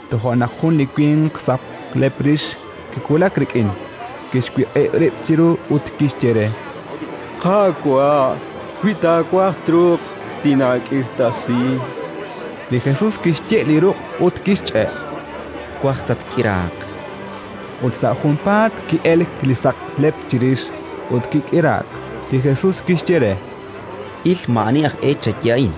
Toja' naq jun li winq saqlep rix kiwulak rik'in, kixwiq'ib' rib' chiru ut kixye re: —Qaawa', wi taawaj, truuq tinaak'irtasi. Li Jesus kixye' li ruq' ut kixch'e': —Twaj, tatk'iraaq, chan re. Ut sa' junpaat ki'elk li saqlep chirix ut kik'iraak. Li Jesus kixye re: —Il, maa'ani aj e chaye a'in;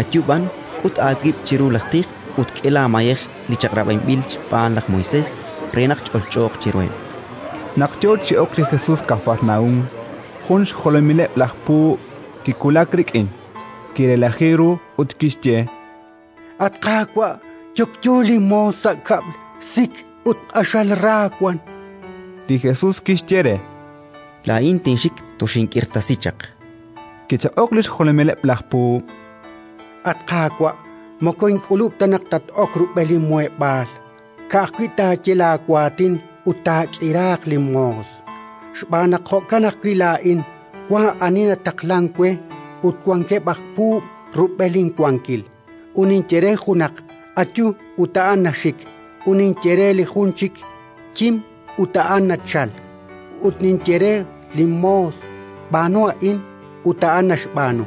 ayu b'an, k'ut aawib' chiru laj tij ut k'e laamayej li chaq'rab'inb'il xb'aan laj Moisés, re naq ch'olch'ooq chiruheb'. Kik'irtasiik li xmoos jun xjolomileb' laj puub' Naq yo chi ok li Jesus Kafarnaúm, jun xjolomileb' laj puub' kiwulak rik'in, kirelaji ru ut kixye: —At Qaawa', yokyo linmoos sa' kab'l, sik ut q'axal ra wank. Li Jesus kixye re: —Laa'in tinxik, toxink'irtasi chaq. Kichaq'ok li xjolomileb' laj puub': —At Qaawa', moko ink'ulub' ta naq tat-ok rub'el linmuheb'aal; ka'ajwi' taaye laawaatin ut taak'iraaq linmoos. Xb'aan naq jo'kan ajwi' laa'in wank ani nataqlank we, ut wankeb' aj puub' rub'el inwankil, ut ninye re junaq: «Ayu», ut a'an naxik; ut ninye re li jun chik: «Kim», ut a'an nachalk; ut ninye re linmoos: «B'aanu a'in», ut a'an naxb'aanu.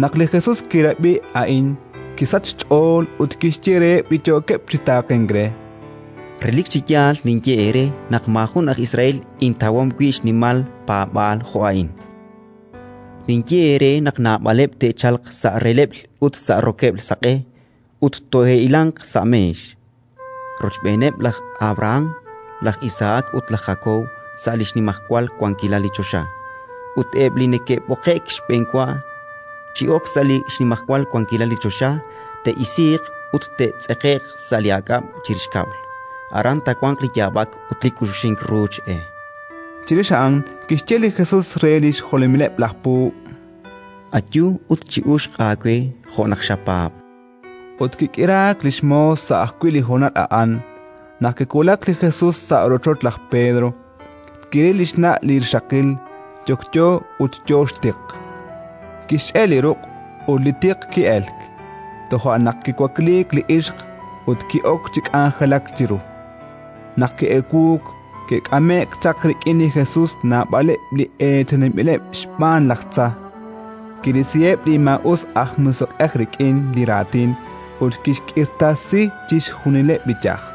Naq li Jesus kirab'i a'in, kisachk xch'ool ut kixye reheb' li yookeb' chi taaqenk re: —Relik chi yaal ninye eere naq maajun aj Israel intawom wi' xnimal paab'aal jo' a'in. Ninye eere naq naab'aleb' te'chalq sa' releb'l ut sa' rokeb'l saq'e, ut tole'hilanq sa' meex rochb'eeneb' laj Abrahán, laj Isahak ut laj Jakob, sa' li xnimajwal wankilal li choxa; ut eb' li ke'b'oqe'k xb'enwa chi ok sa' li xnimajwal wankilal li choxa, te'isiiq ut te'tz'eqe'q sa' li aak'ab' chirix kab'l: aran taawanq li yaab'ak ut li k'uxuxink ruuch e. Chirix a'an kixye li Jesus re li xjolomileb' laj puub': —Ayu ut chi'uxq aawe jo' naq xapaab'. Ut kik'iraak li xmoos sa' ajwi' li honal a'an. Naq kiwulak li Jesus sa' rochoch laj Pedro, kiril li xna' li rixaqil, yokyo ut yo xtiq. Kixch'e' li ruq' ut li tiq ki'elk. Toja' naq kiwakliik li ixq ut ki'ok chi k'anjelak chiru. Naq ki'ewuuk, ke'k'ame'k chaq rik'in li Jesus naab'aleb' li eechaninb'ileb' xb'aan laj tza; kirisiheb' li maa'us aj musiq'ej rik'in li raatin ut kixk'irtasi chixjunileb' li yaj.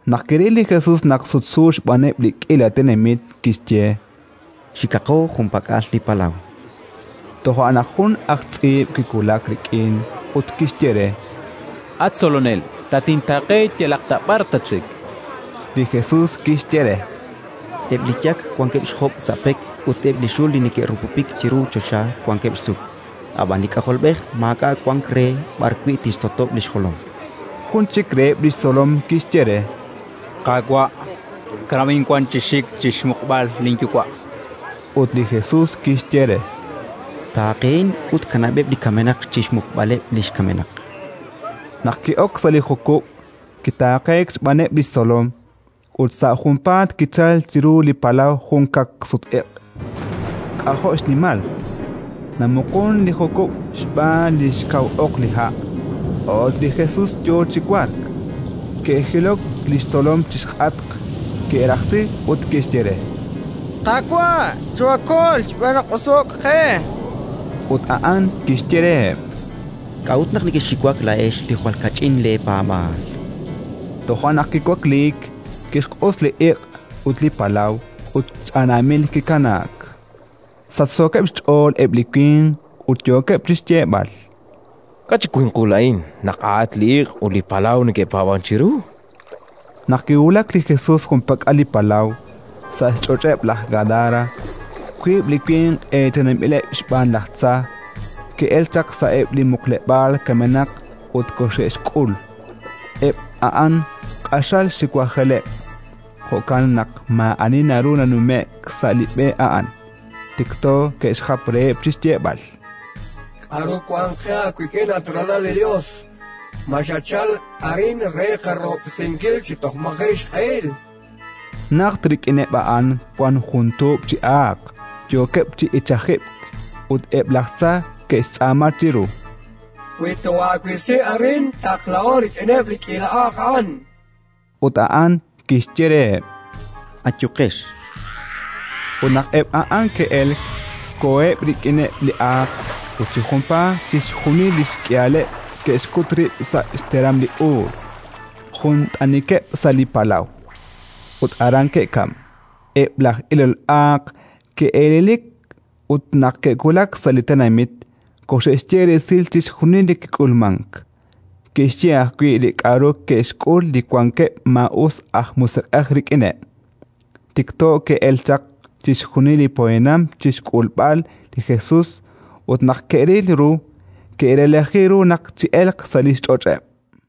Naq kiril li Jesus naq sutsu xb'aaneb' li k'iila tenamit, kixye: —Xikaqo junpak'al li palaw. Toja' naq jun aj tz'iib' kiwulak rik'in ut kixye re: —At Tzolonel, tatintaaqe yalaq ta b'ar tatxik. Li Jesus kixye re: —Eb' li yak wankeb' xjob' sa' pek ut eb' li xul li neke'rupupik chiru choxa wankeb' xsuk, ab'an li K'ajolb'ej maak'a' wank re b'arwi' tixsotob' li xjolom. Jun chik reheb' li xtzolom kixye re: —Qaawa', kanab'in wan chi xik chi xmuqb'al linyuwa'. Ut li Jesus kixye re: —Taaqehin ut kanab'eb' li kamenaq chi xmuqb'aleb' li xkamenaq. Naq ki'ok sa' li jukub', kitaaqeek xb'aaneb' li xtzolom. Ut sa' junpaat kichalk chiru li palaw jun kaqsut-iq' k'ajo' xnimal: namuqun li jukub' xb'aan li xkaw oq li ha'. A'ut li Jesus yo chi wark. Ke'jilok li xtzolom chi xk'atq, ke'rajsi ut ke'xye re: —Qaawa', choohaakol xb'aan naq oso'k qe. Ut a'an kixye reheb': —K'a'ut naq nekexxiwak laa'ex li jwal kach'in leepaab'aal? Toja' naq kiwakliik, kixq'us li iq' ut li palaw, ut ch'anaamil kikanaak. Sachsookeb' xch'ool eb' li winq ut yookeb' chi xyeeb'al: —K'a' chi winqul a'in naq a'atq li iq' ut li palaw neke'paab'ank chiru? Naq kiwulak li Jesus junpak'al li palaw, sa' xch'och'eb' laj Gadara, wiib' li winq eechaninb'ileb' xb'aan laj tza ke'elk chaq sa'eb' li muqleb'aal kamenaq ut koxe'xk'ul. Eb' a'an q'axal xiwajeleb'; jo'kan naq maa'ani naru nanume'k sa' li b'e a'an. Tikto ke'xjap reheb' chi xyeeb'al: —K'aru wank qe aawik'in, at Ralal li Yos? Ma xatchalk arin re qarahob'tesinkil chi toj maji' xq'ehil? Najt rik'ineb' a'an wank jun tuub' chi aaq, yookeb' chi ichajib'k. Ut eb' laj tza ke'xtz'aama chiru: —Wi toohaawisi arin, taqlaho rik'ineb' li k'iila aaq a'an, chankeb'. Ut a'an kixye reheb': —Ayuqex. Ut naq eb' a'an ke'elk, koheb' rik'ineb' li aaq ut chi junpaat chixjunil li xk'ihaleb' ke'xkut rib' sa' xteram li uul, jun t'anikeb' sa' li palaw, ut aran ke'kamk. Eb' laj ilol aaq ke'elelik ut, naq ke'wulak sa' li tenamit, koxe'xye resil chixjunil li kik'ulmank; ke'xye ajwi' li k'aru ke'xk'ul li wankeb' maa'us aj musiq'ej rik'ineb'. Tikto ke'elk chaq chixjunil li poyanam chi xk'ulb'al li Jesus ut, naq ke'ril ru, ke'relaji ru naq chi'elq sa' li xch'och'eb'.